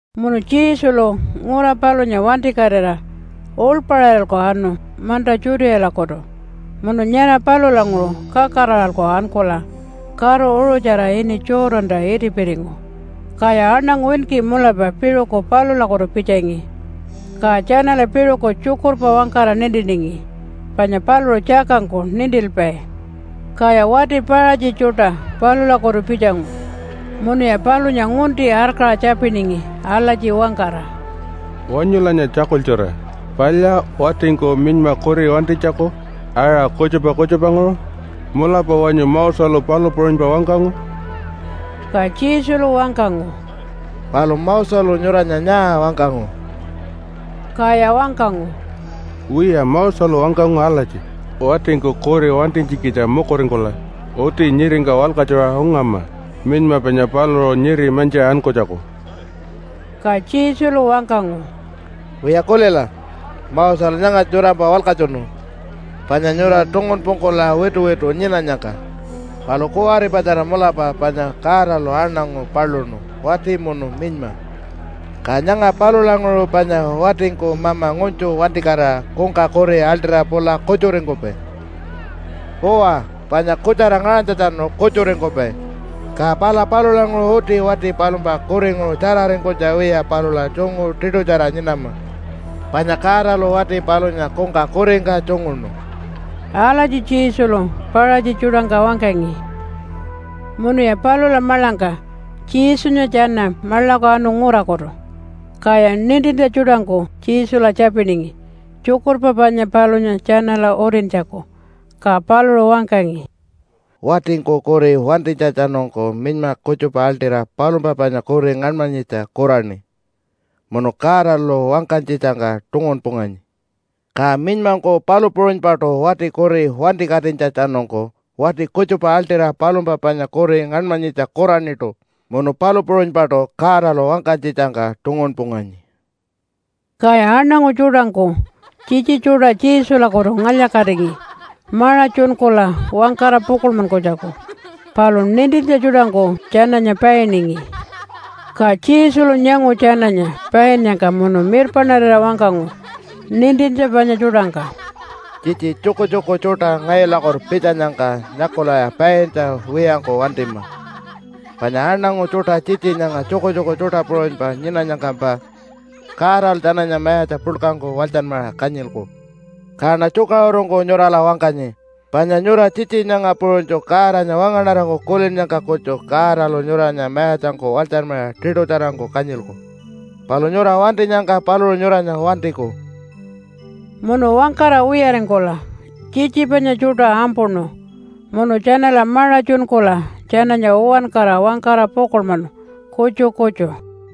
Munu Jesulu ngura palunya wantikatira uḻpaṟiralku anu manta Judealakutu munu nyara palulanguṟu kakaraṟa ankula karu uṟutjara ini Jordanta itipiringu. Kaya aṉangu winki mulapa piṟuku palulakutu pitjangi, ka tjanala piṟuku tjukurpa wangkara nintiningi, panya paluṟu tjakangku nintilpai. Kaya wati Paṟatji tjuṯa palulakutu pitjangu munuya palunya ngunti arkaṟa tjapiningi alatji wangkara, “Wanyulanya tjakultjura! Palya watingku minyma kuri wantinytjaku aṟa kutjupa kutjupanguṟu? Mulapa wanyu Moselu palu puṟunypa wangkangu?” Ka Jesulu wangkangu, “Palu Moselu nyuranya nyaa wangkangu?” Kaya wangkangu, “Wiya, Moselu wangkangu alatji, watingku kuri wantinytjikitja mukuringkula uti nyiringka walkatjuṟa ungama minyma panya paluṟu nyiri mantjiṟa ankunytjaku.” Ka Jesulu wangkangu, “Wiya kulila! Moselu nyangatja nyurampa walkatjunu panya nyura tungunpungkula wituwitu nyinanyangka. Palu kuwaripatjara mulapa panya Godalu aṉangu paluṉu wati munu minyma. Ka nyanga palulanguṟu panya watingku mama ngunytju wantikatira kungka kuri aḻṯira pula kutjuringkupai. Uwa, panya kutjara ngaṟanytjatjanu kutjuringkupai, ka pala palulanguṟu uti wati palumpa kuringuṟu tjararingkunytja wiya palula tjungu tiṯutjara nyinama, panya Godalu wati palunya kungka kuringka tjunguṉu.” Alatji Jesulu Paṟatji tjuṯangka wangkangi. Munuya palula maḻangka Jesunya tjana maḻaku anu ngurakutu. Kaya nintintja tjuṯangku Jesula tjapiningi tjukurpa panya palunya tjanala utintjaku. Ka paluṟu wangkangi, “Watingku kuri wantinytjatjanungku minyma kutjupa aḻṯira palumpa panya kuri ngaṉmanyitja kuraṉi munu Godalu wangkanytjitjangka tungunpunganyi. Ka minymangku palu puṟunypaṯu wati kuri wantikatinytjatjanungku, wati kutjupa aḻṯira palumpa panya kuri ngaṉmanyitja kuraṉiṯu, munu palu puṟunypaṯu Godalu wangkanytjitjangka tungunpunganyi.” Kaya aṉangu tjuṯangku tjitji tjuṯa Jesulakutu ngalya-katingi maṟa tjunkula wangkara pukuḻmanytjaku, palu nintintja tjuṯangku tjananya painingi. Ka Jesulu nyangu tjananya painnyangka munu mirpaṉarira wangkangu nintintja panya tjuṯangka, “Tjitji tjukutjuku tjuṯa ngayulakutu pitjanyangka nyakulaya paintja wiyangku wantima! Panya aṉangu tjuṯa tjitji nyanga tjukutjuku tjuṯa puṟunypa nyinanyangkampa, Godalu tjananya mayatja puḻkangku walytjanmaṟa kanyilku. Kaṉa tjukaṟurungku nyurala wangkanyi, panya nyura tjitji nyanga puṟunytju Godanya wangaṉarangku kulinnyangka kutju, Godalu nyuranya mayatjangku walytjanmaṟa tiṯutjarangku kanyilku. Palu nyura wantinyangka paluṟu nyuranya wantiku.” Munu wangkara wiyaringkula tjitji panya tjuṯa ampuṉu munu tjanala maṟa tjunkula tjananya uwankara wangkara pukuḻmanu kutju kutju.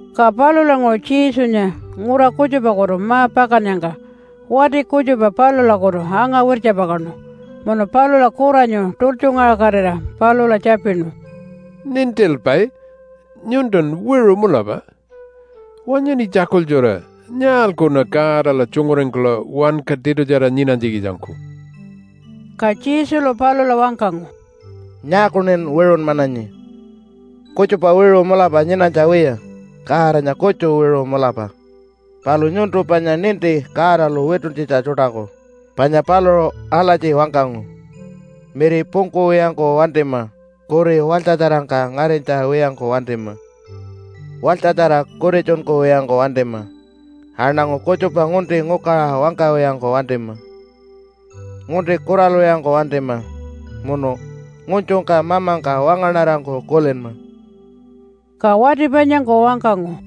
Ka palulanguṟu Jesunya ngura kutjupakutu ma-pakannyangka wati kutjupa palulakutu anga-wirtjapakaṉu, munu palula kuranyu tultjungaṟakatira palula tjapinu, “Nintilpai, nyuntun wiṟu mulapa! Wanyuṉi tjakultjura, nyaalkuṉa Godala tjunguringkula wanka tiṯutjara nyinanytjikitjangku?” Ka Jesulu palula wangkangu, “Nyaakuṉin wiṟunmananyi? Kutjupa wiṟu mulapa nyinanytja wiya, Godanya kutju wiṟu mulapa. Palu nyuntu panya ninti Godalu wituntjitja tjuṯaku. Panya paluṟu alatji wangkangu, miri pungkuwiyangku wantima, kuri walytjatjarangka ngarinytja wiyangku wantima, walytjatjara kutitjunkuwiyangku wantima, aṉangu kutjupa ngunti ngukaṟa wangkawiyangku wantima, ngunti kuralwiyangku wantima, munu ngunytjungka mamangka wangaṉarangku kulinma.” Ka wati panyangku wangkangu,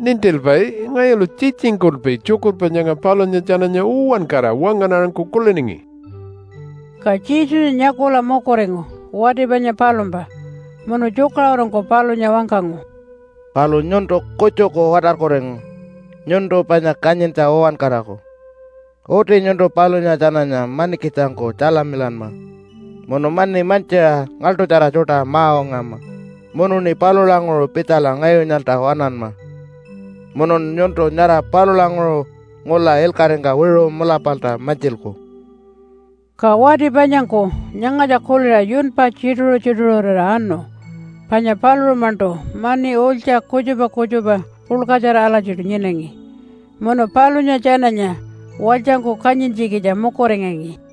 “Nintilpai, ngayulu tjitjingkulpi tjukurpa nyanga palunya tjananya uwankara wangaṉarangku kuliningi.” Ka Jesunya nyakula mukuringu wati panya palumpa munu tjukaṟurungku palunya wangkangu, “Palu nyuntu kutjuku watarkuringu, nyuntu panya kanyintja uwankaraku. Uti nyuntu palunya tjananya manikitjangku tjalamilanma, munu mani mantjiṟa ngaḻṯutjara tjuṯa ma-ungama, munuṉi palulanguṟu pitjala ngayunyalta waṉanma. Munun nyuntu nyara palulanguṟu ngula ilkaṟingka wiṟu mulapalta mantjilku.” Ka wati panyangku nyangatja kuliṟa yunpa tjituṟu-tjituṟurira anu, panya paluṟu-maṉṯu mani ulytja kutjupa kutjupa puḻkatjara alatjiṯu nyinangi, munu palunya tjananya walytjangku kanyintjikitja mukuringangi.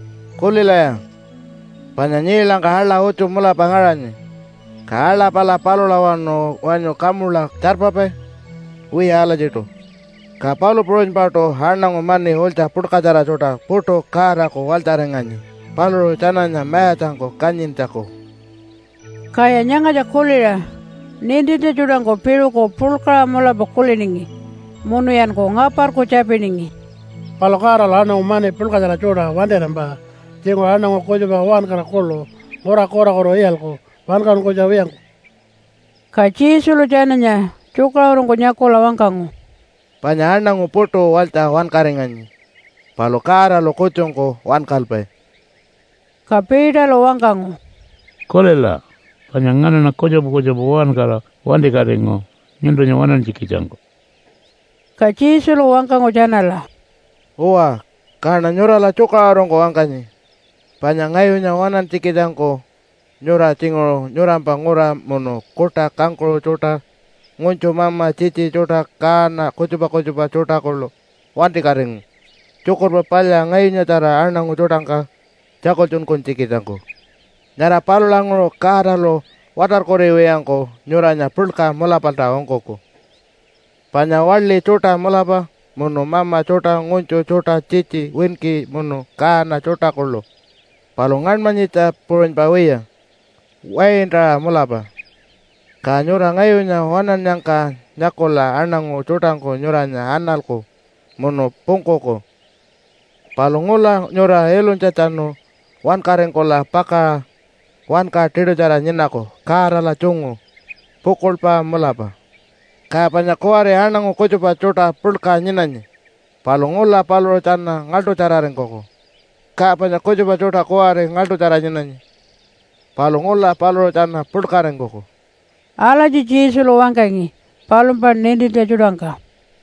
Kulilaya! Panya nyiilangka aḻa utju mulapa ngaṟanyi. Ka aḻa pala palulawanu wanyu kamula tjarpapai? Wiya alatjiṯu. Ka palu puṟunypaṯu aṉangu mani ulytja puḻkatjara tjuṯa puṯu Godaku walytjaringanyi, paluṟu tjananya mayatjangku kanyintjaku.” Kaya nyangatja kuliṟa nintintja tjuṯangku piṟuku puḻkaṟa mulapa kuliningi munuyanku ngaparku tjapiningi, “Palu Godalu aṉangu mani puḻkatjara tjuṯa wantirampa tjinguṟu aṉangu kutjupa uwankara kuḻu ngura kurakutu iyalku wankaṟunkunytja wiyangku.” Ka Jesulu tjananya tjukaṟurungku nyakula wangkangu, “Panya aṉangu puṯu walytja wankaringanyi, palu Godalu kutjungku wankalpai.” Ka Peterlu wangkangu, “Kulila, panya nganaṉa kutjupa kutjupa uwankara wantikatingu nyuntunya waṉantjikitjangku.” Ka Jesulu wangkangu tjanala, “Uwa, kaṉa nyurala tjukaṟurungku wangkanyi, panya ngayunya waṉantjikitjangku nyura tjinguṟu nyurampa ngura, munu kuṯa, kangkuṟu tjuṯa, ngunytju, mama, tjitji tjuṯa, kaana kutjupa kutjupa tjuṯa kuḻu wantikatingu Tjukurpa Palya ngayunyatjara aṉangu tjuṯangka tjakultjunkunytjikitjangku. Nyara palulanguṟu Godalu watarkuriwiyangku nyuranya puḻka mulapalta ungkuku, panya waḻi tjuṯa mulapa munu mama tjuṯa, ngunytju tjuṯa, tjitji winki munu kaana tjuṯa kuḻu, palu ngaṉmanyitja puṟunypa wiya, waintaṟa mulapa. Ka nyura ngayunya waṉannyangka nyakula aṉangu tjuṯangku nyuranya analku munu pungkuku. Palu ngula nyura ilunytjatjanu wankaringkula pakaṟa wanka tiṯutjara nyinaku Godala tjungu pukuḻpa mulapa. Ka panya kuwari aṉangu kutjupa tjuṯa puḻka nyinanyi, palu ngula paluṟu tjana ngaḻṯutjararingkuku, ka panya kutjupa tjuṯa kuwari ngaḻṯutjara nyinanyi, palu ngula paluṟu tjana puḻkaringkuku.” Alatji Jesulu wangkangi palumpa nintintja tjuṯangka.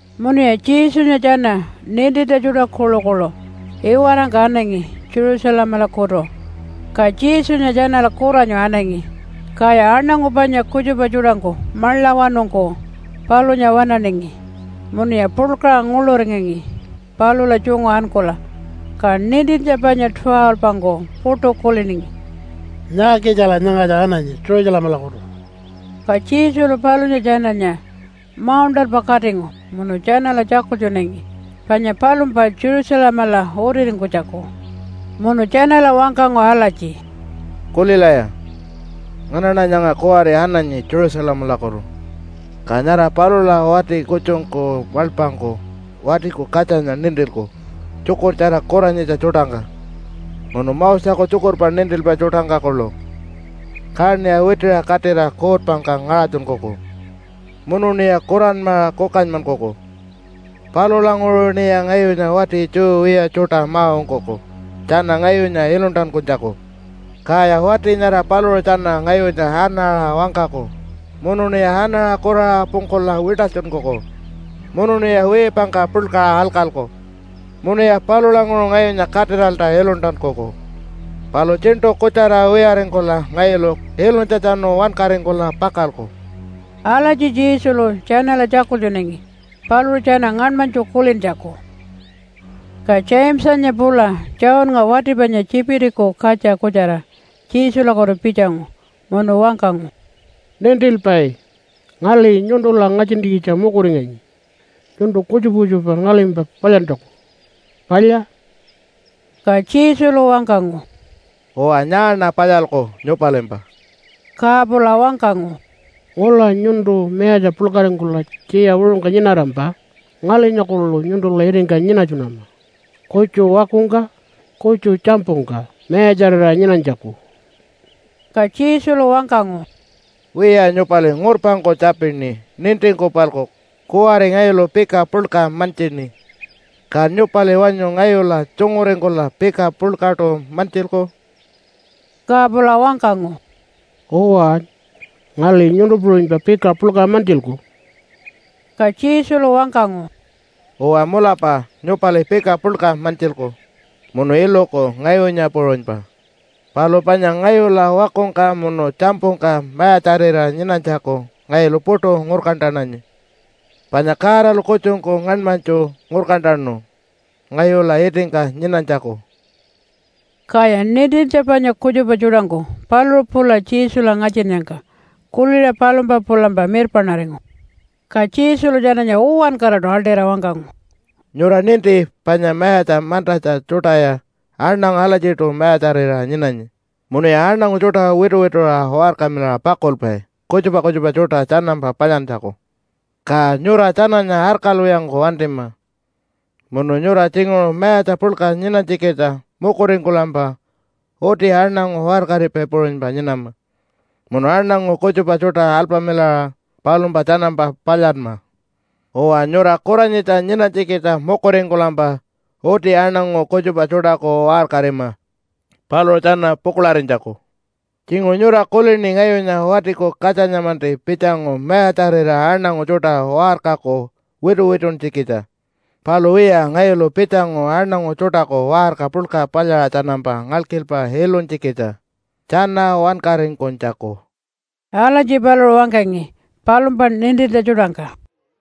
Munuya Jesunya tjana nintintja tjuṯa kuḻukuḻu iwarangka anangi Jerusalemalakutu. Ka Jesunya tjanala kuranyu anangi, kaya aṉangu panya kutjupa tjuṯangku maḻawanungku palunya waṉaningi munuya puḻkaṟa nguḻuringangi palula tjungu ankula. Ka nintintja panya 12-ngku puṯu kuliningi, “Nyaakitjala nyangatja ananyi Jerusalemalakutu?” Ka Jesulu palunya tjananya mauṉṯalpa katingu munu tjanala tjakultjunangi panya palumpa Jerusalemala utiringkunytjaku. Munu tjanala wangkangu alatji, “Kulilaya, nganaṉa nyanga kuwari ananyi Jerusalemalakutu, ka nyara palula wati kutjungku maḻpangku Watiku Katjanya nintilku tjukurtjara kuranyitja tjuṯangka munu Moseku tjukurpa nintilpai tjuṯangka kuḻu, kaṉiya witiṟa katira kuutpangka ngaṟatjunkuku, munuṉiya kuranmaṟa kukanymankuku. Palulanguṟuṉiya ngayunya wati Jew wiya tjuṯa ma-ungkuku tjana ngayunya iluntankunytjaku. Kaya wati nyara paluṟu tjana ngayunya anaṟa wangkaku, munuṉiya anaṟa kuraṟa pungkula wiṯalytjunkuku munuṉiya wiipangka puḻkaṟa alkalku, munuya palulanguṟu ngayunya katiralta iluntankuku. Palu tjiṉṯu kutjara wiyaringkula ngayulu ilunytjatjanu wankaringkula pakalku.” Alatji Jesulu tjanala tjakultjunangi paluṟu tjana ngaṉmanytju kulintjaku. Ka Jamesanya pula Johnnga wati panya Tjipitiku katja kutjara Jesulakutu pitjangu munu wangkangu, “Nintilpai, ngali nyuntula ngatjintjikitja mukuringanyi nyuntu kutjupa kutjupa ngalimpa palyantjaku. Palya?” Ka Jesulu wangkangu, “Uwa, nyaaṉa palyalku nyupalimpa?” Ka pula wangkangu, “Ngula nyuntu mayatja puḻkaringkula tjiya wiṟungka nyinarampa ngalinya kuḻu nyuntula itingka nyinatjunama, kutju wakungka kutju tjampungka mayatjarira nyinanytjaku.” Ka Jesulu wangkangu, “Wiya nyupali ngurpangku tjapini nintingku-palku. Kuwari ngayulu pika puḻka mantjini. Ka nyupali wanyu ngayula tjunguringkula pika puḻkaṯu mantjilku?” Ka pula wangkangu, “Uwa, ngali nyuntu puṟunypa pika puḻka mantjilku.” Ka Jesulu wangkangu, “Uwa, mulapa nyupali pika puḻka mantjilku munu iluku ngayunya puṟunypa. Palu panya ngayula wakungka munu tjampungka mayatjarira nyinanytjaku ngayulu puṯu ngurkantananyi, panya Godalu kutjungku ngaṉmanytju ngurkantanu ngayula itingka nyinanytjaku.” Kaya nintintja panya kutjupa tjuṯangku paluṟu pula Jesula ngatjinnyangka kuliṟa palumpa pulampa mirpaṉaringu. Ka Jesulu tjananya uwankaraṯu aḻṯira wangkangu, “Nyura ninti panya mayatja mantatja tjuṯaya aṉangu alatjiṯu mayatjarira nyinanyi, munuya aṉangu tjuṯa wituwituṟa waṟkamilaṟa pakulpai kutjupa kutjupa tjuṯa tjanampa palyantjaku. Ka nyura tjananya arkalwiyangku wantima. Munu nyura tjinguṟu mayatja puḻka nyinanytjikitja mukuringkulampa, uti aṉangu waṟkaripai puṟunypa nyinama, munu aṉangu kutjupa tjuṯa alpamilaṟa palumpa tjanampa palyanma. Uwa, nyura kuranyitja nyinanytjikitja mukuringkulampa uti aṉangu kutjupa tjuṯaku waṟkarima paluṟu tjana pukuḻarinytjaku. Tjinguṟu nyura kulini ngayunya Watiku Katjanya-manti pitjangu mayatjarira aṉangu tjuṯa waṟkaku wituwituntjikitja. Palu wiya, ngayulu pitjangu aṉangu tjuṯaku waṟka puḻka palyaṟa tjanampa ngalkilpa ilunytjikitja, tjana wankaringkunytjaku.” Alatji paluṟu wangkangi palumpa nintintja tjuṯangka.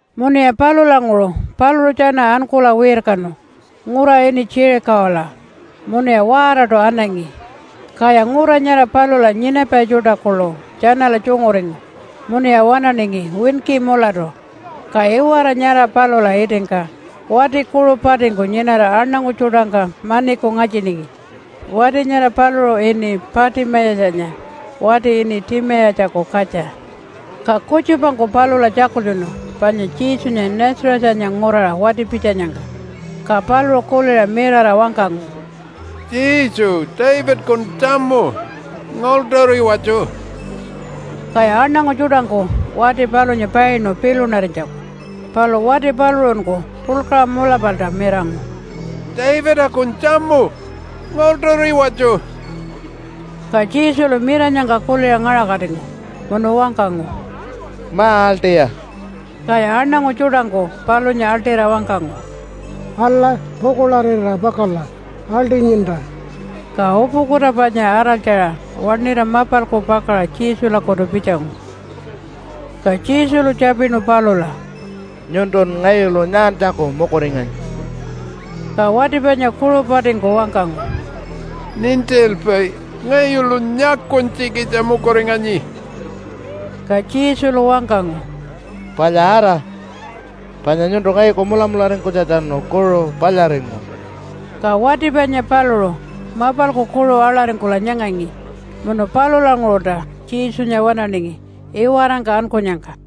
Munuya palulanguṟu paluṟu tjana ankula wirkanu ngura ini Jerichola munuya waaraṯu anangi. Kaya ngura nyara palula nyinapai tjuṯa kuḻu tjanala tjunguringu munuya waṉaningi winki mulatu. Ka iwara nyara palula itingka wati kuṟu patingku nyinara aṉangu tjuṯangka maniku ngatjiningi. Wati nyara paluṟu ini Patimayatjanya wati ini Timayatjaku katja. Ka kutjupangku palula tjakultjunu panya Jesunya Nazarethanya nguraṟa wati-pitjanyangka, ka paluṟu kuliṟa mirara wangkangu, “Jesu, Davidakun tjamu, ngaḻṯuriwatju.” Kaya aṉangu tjuṯangku wati palunya painu pilunarinytjaku. Palu wati paluṟunku puḻkaṟa mulapalta mirangu, “Davidakun tjamu, ngaḻṯuriwatju.” Ka Jesulu miranyangka kuliṟa ngaṟakatingu munu wangkangu, “Ma-aḻṯiya!” Kaya aṉangu tjuṯangku palunya aḻṯira wangkangu, “Ala, pukuḻarira pakala. Aḻṯinyinta.” Ka upukuta panya araltjaṟa waṉira mapalku pakaṟa Jesulakutu pitjangu. Ka Jesulu tjapinu palula, “Nyuntun ngayulu nyaantjaku mukuringanyi?” Ka wati panya kuṟu patingku wangkangu, “Nintilpai, ngayulu nyakunytjikitja mukuringanyi.” Ka Jesulu wangkangu, “Palya ara. Panya nyuntu ngayuku mulamularingkunytjatjanu kuṟu palyaringu.” Ka wati panya paluṟu mapalku kuṟu aḻaringkula nyangangi munu palulanguṟulta Jesunya waṉaningi iwarangka ankunyangka.